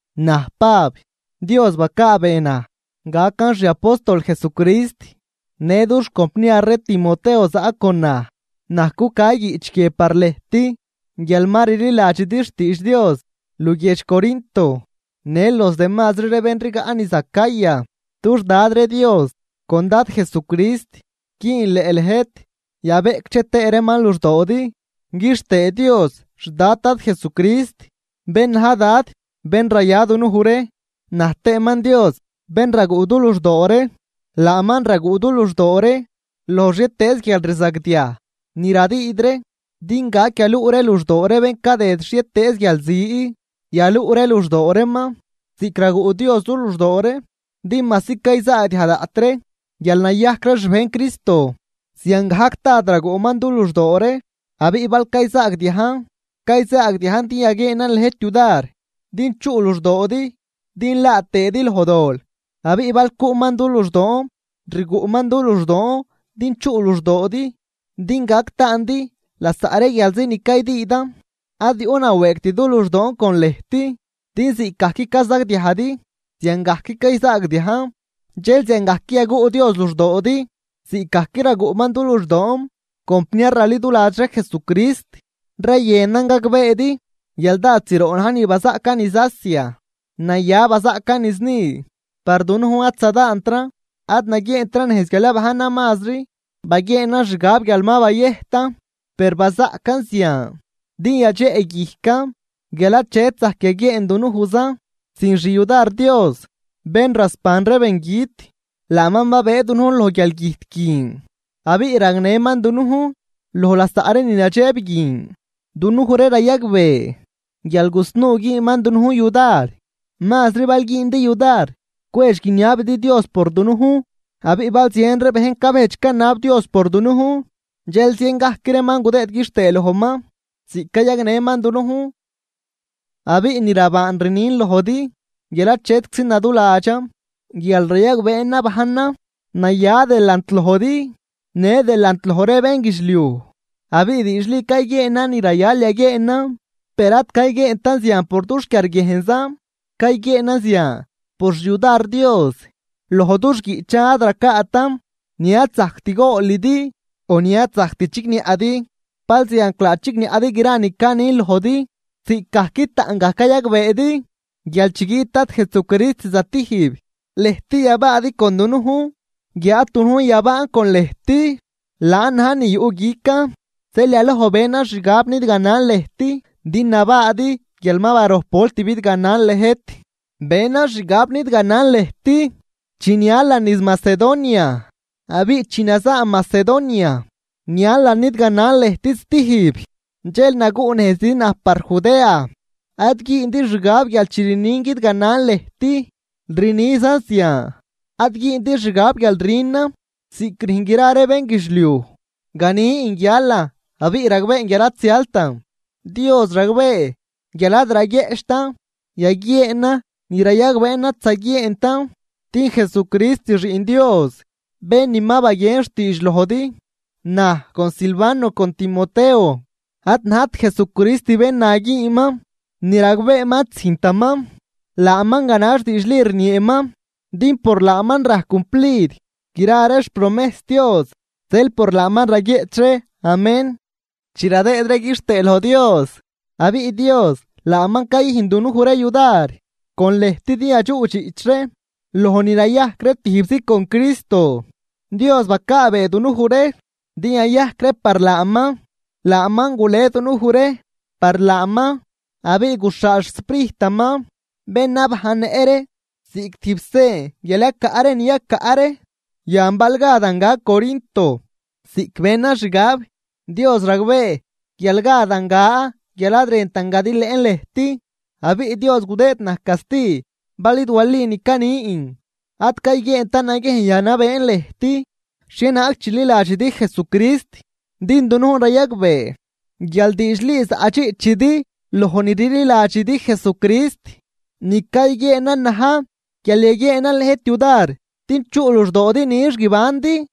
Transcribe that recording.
Naj Pab, Dios bacaabee naj gacan xi apóstol Jesucrist, në dux compniar ree Timoteo zaꞌ con naj. Naj cuca guiꞌch guie par lëjt guial ma rliladxidi xtiidx Dios luguiedx Corinto në los demazri ree bén rigaꞌ niz Acaya. Dux Dad ree Dios con Dad Jesucrist güünleꞌ lëjt yabeꞌcdxe tëë reeman luxdoodi. Quixtëë Dios xDad Dad Jesucrist, bén na̱j Dad bén raya dunuj ree naj tëëman Dios bén raguꞌ du luxdoo ree. Laaman raguꞌ du luxdoo ree loj xhietëëz guialrzagdiaj ni radüüd ree din gac yaluꞌ ree luxdoo ree bén cadëd xhietëëz guialzi, yaluꞌ ree luxdoo reeman ziꞌc raguꞌ Dios du luxdoo ree. Din majsi cayzaagdiaj daꞌt ree guial nayajc ree xbejn Cristo, ziangajc dád raguꞌman du luxdoo ree. Abiꞌ bal cayzaagdiajn, cayzaagdiajn din yaguieenan lëjt yudar din chuꞌ luxdoodi din laa tëëdi loj dol. Abiꞌ bal cuꞌman du luxdoon, rguꞌman du luxdoon din chuꞌ luxdoodi din gac taandi lasaꞌ ree guialzi ni caydüüdan. Ad yuꞌ nawëëgt du luxdoon con lëjt, din ziꞌcgajc cazagdiajdi ziangajc cayzaagdiajn dxel ziangajc yaguꞌ Dios luxdoodi ziꞌcgajc raguꞌman du luxdoon. Compniar raliduladx ree Jesucrist, rayënan gagbeedi guial dád zroꞌ na̱j ni bazaꞌcan niz Asia. Naya bazaꞌcan niz ni, par dunujn ad zadaantran, ad naguieentran nejz guial yabajnran mazri, baguieenan xgab guial ma bayëjtan. Per bazaꞌcan zian din yadxeꞌguijcan guial achet zajc yaguieen dunujzan sin xyudar Dios, bén rasban ree bengüt. Laaman babëë dunujn loj guialgüjt guin abiꞌ gagnëman dunujn loj lasaꞌ ree ni nadxeb guin. Dunuj ree rayagbee guial gusnuu güünman dunujn yudar, mazri bal güündi yudar cwedx guiniabidi Dios por dunujn. Abiꞌ bal zien ree bejn cabejdx canab Dios por dunujn dxel zien gajc reeman gudëëd quixtëë lojman ziꞌc cayagnëman dunujn. Abiꞌ ni rabaan rnin lojdi guial achetczi naduladxan guial rayagbeen nabajnan naya delant lojdi në delant loj ree bénguidxliuj, abiꞌ diidxli cayguieenan ni rayal yaguieenan. Per ad cayguieentan zian por dux quiarguiejnzan, cayguieenan zian por xyudar Dios. Loj dux guiꞌchan ad racaatan ni ad zajct goolidi o ni ad zajct chigniaꞌdi. Balzianclaa chigniaꞌdi gra ni canin lojdi. Ziꞌcgajc taꞌngaj cayagbeedi guial chi guiꞌt Dad Jesucrist zatijb lëjt yabaadi con dunujn guiáad dunujn yabaan con lëjt. Laan na̱j ni yuꞌguican, zeel yaloj benan xgab nidganan lëjt din nabaadi guial ma barojp volt bidganan lëjt. Benan xgab nidganan lëjt chi nialan niz Macedonia, abiꞌ chi nazaan Macedonia nialan nidganan lëjt stijb, dxel naguꞌnejzidi naj par Judea. Ad güündi xgab guial chi rnin guidganan lëjt rnizan zian. Ad güündi xgab guial rünan ziꞌc rüjn gra ree bénguidxliuj, ganin guialan abiꞌ ragbeen guial ad zialtan. Dios ragbee guial ad raguieꞌchtan yaguieenan ni rayagbeen ad zaguieentan. Din Jesucrist Xiꞌn Dios, bén ni ma baguien xtiidx lojdi, naj con Silvano con Timoteo, ad najt Jesucrist bén na güünman ni ragbeeman ad züjntaman, laaman ganax diidxli rnieeman. Din por laaman rajc cumplid gra ree xpromejs Dios. Zeel por laaman raguieꞌch ree “Amén” chi radëëd ree quixtëë loj Dios. Abiꞌ Dios laaman cayüjn dunuj ree yudar con lëjt din yadxuꞌdxiꞌch ree loj ni nayajc ree tijbzi con Cristo, Dios bacaabee dunuj ree din yayajc ree par laaman. Laaman gule dunuj ree par laaman, abiꞌ guxhaal xSprijtaman bén nabajnnëꞌ ree ziꞌc tijb sen guial yacaꞌ ree ni yacaꞌ ree. Yan bal gadan ga Corinto ziꞌc benan xgab, Dios ragbee guial gadan ga guial ad rëntan gadilëꞌn lëjt, abiꞌ Dios gudëëd naj casti bal id wali ni canin. Ad cayguieentan naguiejn yanabeen lëjt xhienaag chililadxidi Jesucrist, din dunujn rayagbee guial diidxli zaꞌdxiꞌchidi loj ni rliladxidi Jesucrist, ni cayguieenan na̱j guial yaguieenan lëjt yudar din chuꞌ luxdoodi nix guibandi.